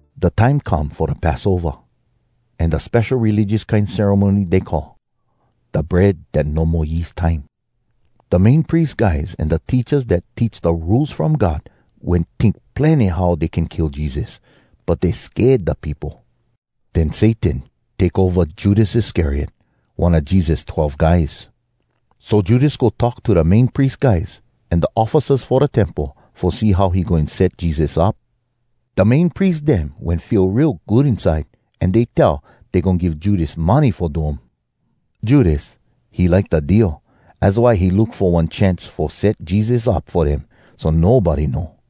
Da time come fo da Passova, an da spesho religious kine ceremony dey call Da Bread Dat No Mo Yeast time. Da Main Pries guys an da teachas dat teach da Rules From God wen tink plenny how dey can kill Jesus. But dey sked da peopo. Den Satan take ova Judas Iscariot, one a Jesus twelve guys. So Judas go talk to da Main Pries guys, an da officers fo da Temple, fo see how he goin set Jesus up. Da Main Pries dem wen feel real good inside, an dey tell dey goin give Judas money fo do um. Judas, he like da deal. Az why he look fo one chance fo set Jesus up fo dem so nobody know.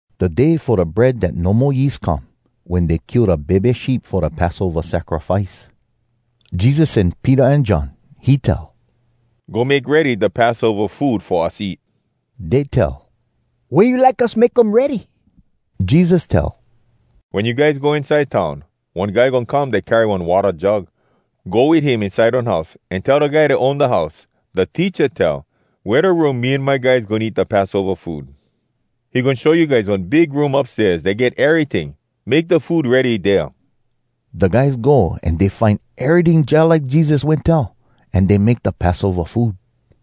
Da day fo da Bread Dat No Mo Yeast come, wen dey kill da bebe sheep fo da Passova sacrifice. Jesus sen Peter an John. He tell, “Go make ready da Passova food fo us eat.” Dey tell, “Wea you like us make um ready?” Jesus tell, “Wen you guys go inside town, one guy goin come dat carry one watta jug. Go wit him inside one house, an tell da guy dat own da house, ‘Da Teacha tell, “Wea da room me an my guys goin eat da Passova food?” ’ He goin show you guys one big room upstairs, dat get eryting. Make da food ready dea.” Da guys go an dey find eryting jalike Jesus wen tell. An dey make da Passova food.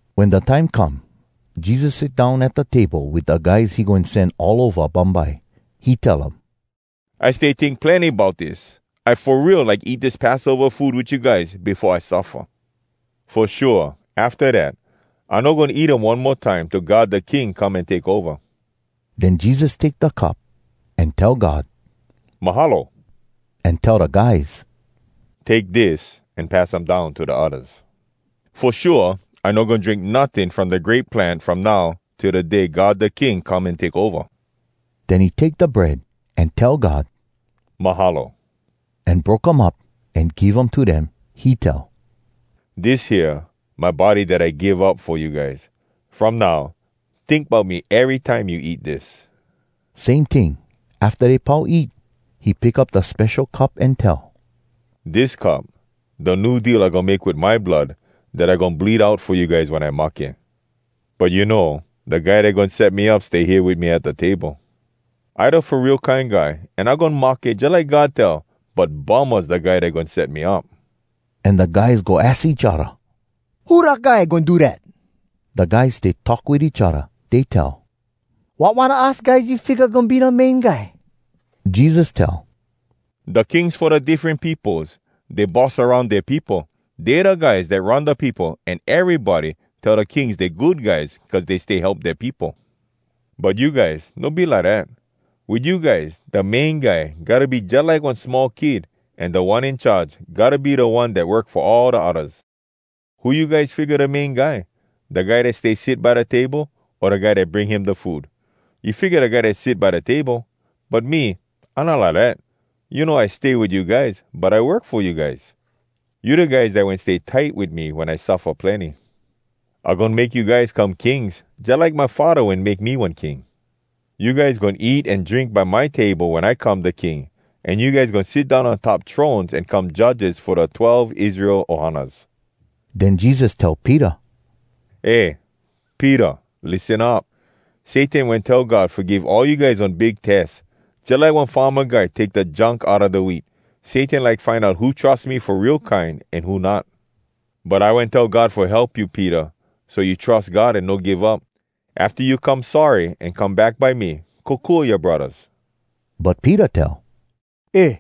Wen da time come, Jesus sit down at da table wit da guys he goin sen all ova bumbye. He tell um, “I stay tink plenny bout dis. I fo real like eat dis Passova food wit you guys befo I suffa. Fo shua, afta dat, I no goin eat um one mo time till God da King come an take ova.” Den Jesus take da cup, an tell God “Mahalo” an tell da guys, “Take dis an pass um down to da oddas. Fo shua, I no goin drink notting from da grape plant from now till da day God da King come an take ova.” Den he take da bread, an tell God “Mahalo,” an broke um up, an give um to dem. He tell, “Dis hea, my body dat I give up fo you guys. From now, tink bout me erytime you eat dis.” Same ting, afta dey pau eat, he pick up da spesho cup an tell, “Dis cup, da New Deal I goin make wit my blood dat I goin bleed out fo you guys wen I mahke. But you know, da guy dat goin set me up stay hea wit me at da table. I da Fo Real Kine Guy, an I goin mahke jalike God tell, but bummahs da guy dat goin set me up!” An da guys go aks each odda, “Who da guy goin do dat?” Da guys stay talk wit each odda. Dey tell, “Wat one a us guys you figga goin be da main guy?” Jesus tell, “Da kings fo da diffren peopos, dey boss aroun dea peopo. Dey da guys dat run da peopo, an erybody tell da kings dey good guys cuz dey stay help dea peopo. But you guys, no be lidat. Wit you guys, da main guy gotta be jalike one small kid, an da one in charge gotta be da one dat work fo all da oddas. Who you guys figga da main guy? Da guy dat stay sit by da table o da guy dat bring him da food? You figga da guy dat sit by da table? But me, I not lidat. You know, I stay wit you guys, but I work fo you guys. “You da guys dat wen stay tight wit me wen I suffa plenny. I goin make you guys come kings jalike my Faddah wen make me one king. You guys goin eat an drink by my table wen I come da King, an you guys goin sit down on top thrones, an come judges fo da twelve Israel ohanas.” Den Jesus tell Peter, “Eh, Peter, lissen up! Satan wen tell God fo give all you guys one big tes. Jalike one farma guy take da junk outa da wheat, Satan like find out who trus me fo real kine an who not. But I wen tell God fo help you, Peter, so you trus God an no give up. Afta you come sorry an come back by me, kokua yoa braddahs.” But Peter tell, “Eh,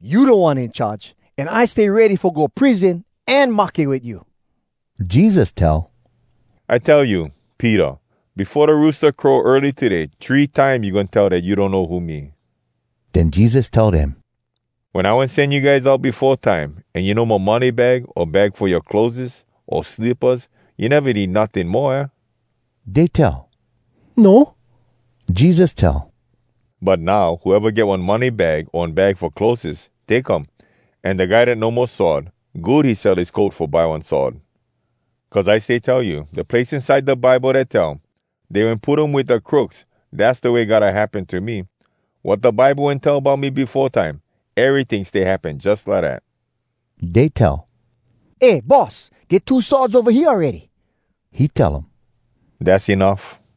you Da One In Charge, an I stay ready fo go prison an mahke wit you.” Jesus tell, “I tell you, Peter, befo da roosta crow early today, three time you goin tell dat you donno who me.” Den Jesus tell dem, “Wen I wen sen you guys out befo time, an you no mo money bag, o bag fo yoa clotheses, o slippas, you neva need notting moa, aah?” Dey tell, “No.” Jesus tell, “But now, whoeva get one money bag o one bag fo clotheses, take um. An da guy dat no mo sword, good he sell his coat fo buy one sword. Cuz I stay tell you, da place inside da Bible dat tell, ‘Dey wen put him wit da crooks,’ dass da way gotta happen to me. Wat da Bible wen tell bout me befo time, eryting stay happen jus lidat.” Dey tell, “Eh Boss, get two swords ova hea awready.” He tell um, “Dass enuff.”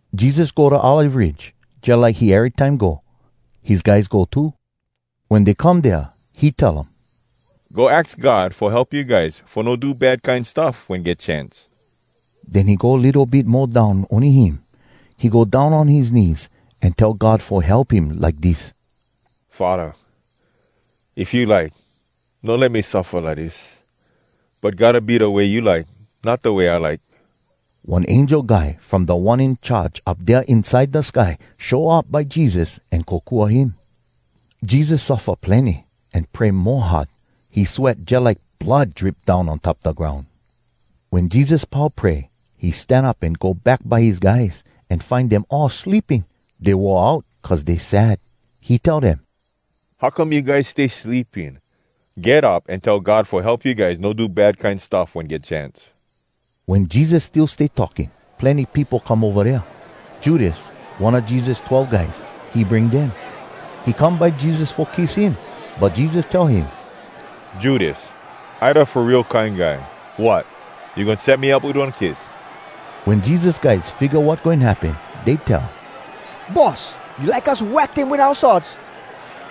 Jesus go da Olive Ridge, jalike he erytime go. His guys go too. Wen dey come dea, he tell um, “Go aks God fo help you guys fo no do bad kine stuff wen get chance.” Den he go litto bit mo down ony him. He go down on his knees, an tell God fo help him like dis: “Faddah, if you like, no let me suffa lidis. But gotta be da way you like, not da way I like.” [One angel guy from Da One In Charge Up Dea Inside Da Sky show up by Jesus an kokua him.] Jesus suffa plenny, an pray mo hard. He sweat jalike blood drip down on top da groun. Wen Jesus pau pray, he stan up an go back by his guys, an find dem all sleeping. Dey wore out, cuz dey sad. He tell dem, “How come you guys stay sleeping? Get up an tell God fo help you guys no do bad kine stuff wen get chance.” Wen Jesus still stay talking, plenny peopo come ova dea. Judas, one a Jesus twelve guys, he bring dem. He come by Jesus fo kiss him. But Jesus tell him, “Judas, I da Fo Real Kine Guy. Wot! You goin set me up wit one kiss?!” Wen Jesus guys figga wat goin happen, dey tell, “Boss, you like us wack dem wit oua swords?”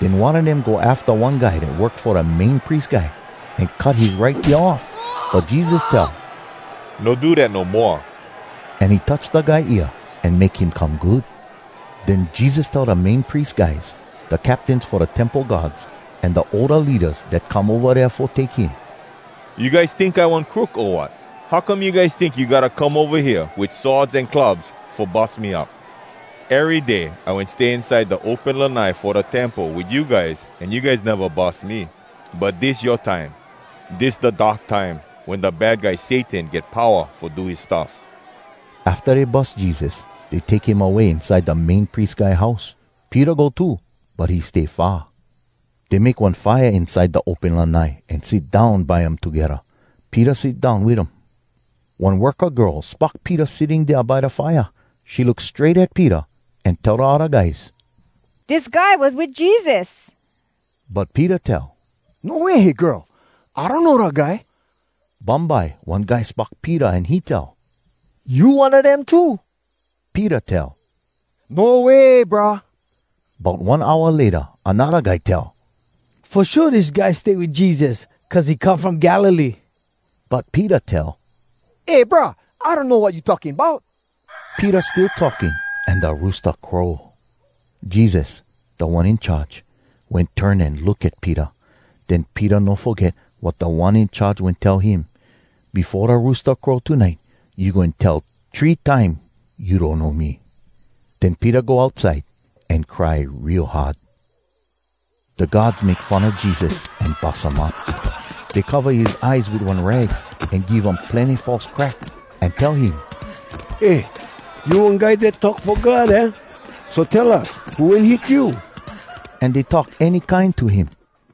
Den one a dem go afta one guy dat work fo da Main Pries Guy, an cut his right ear off. But Jesus tell, “No do dat no moa!” An he touch da guy ear an make him come good. Den Jesus tell da Main Pries guys, da captains fo da Temple guards, an da older leadas dat come ova dea fo take him, “You guys tink I one crook o wat? How come you guys tink you gotta come ova hea wit swords an clubs fo bus me up? Ery day I wen stay inside da open lanai fo da Temple wit you guys, an you guys neva bus me. But dis yoa time. Dis da dark time, wen da Bad Guy Satan get powa fo do his stuff.” Afta dey bus Jesus, dey take him away inside da Main Pries Guy house. Peter go too, but he stay far. Dey make one fire inside da open lanai, an sit down by um togedda. Peter sit down wit um. One worka girl spock Peter sitting dea by da fire. She look strait at Peter, an tell da odda guys, “Dis guy was wit Jesus!” But Peter tell, “No way, girl! I donno da guy!” Bumbye one guy spock Peter an he tell, “You one a dem too!” Peter tell, “No way, brah!” Bout one hour layta anodda guy tell, “Fo shua dis guy stay wit Jesus, cuz he come from Galilee.” But Peter tell, “Eh, brah, I donno wat you talking bout!” Peter still talking, an da roosta crow. Jesus, Da One In Charge, wen turn an look at Peter. Den Peter no foget wat Da One In Charge wen tell him, “Befo da roosta crow tonite, you goin tell three time you donno me.” Den Peter go outside an cry real hard. Da guards make fun a Jesus an bus um up. Dey cova his eyes wit one rag, an give um plenny false crack, an tell him, “Eh, you one guy dat talk fo God, aah? So, tell us who wen hit you!” An dey talk any kine to him.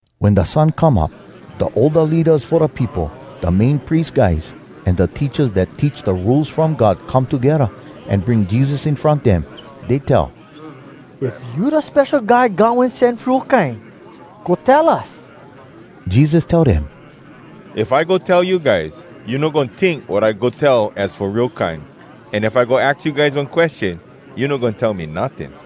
Wen da sun come up, da older leadas fo da peopo, da Main Pries guys, an da teachas dat teach da Rules From God come togedda, an bring Jesus in front dem. Dey tell, “If you da Spesho Guy God Wen Sen fo real kine, go tell us.” Jesus tell dem, “If I go tell you guys, you no goin tink wat I go tell az fo real kine. An if I go aks you guys one question, you no goin tell me notting.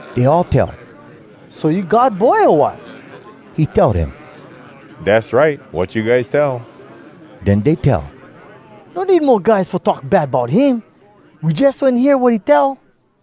Dey all tell, “So you God Boy, o wat?” He tell dem, “Dass right, wat you guys tell.” Den dey tell, “No need mo guys fo talk bad bout him! We jus wen hear wat he tell!”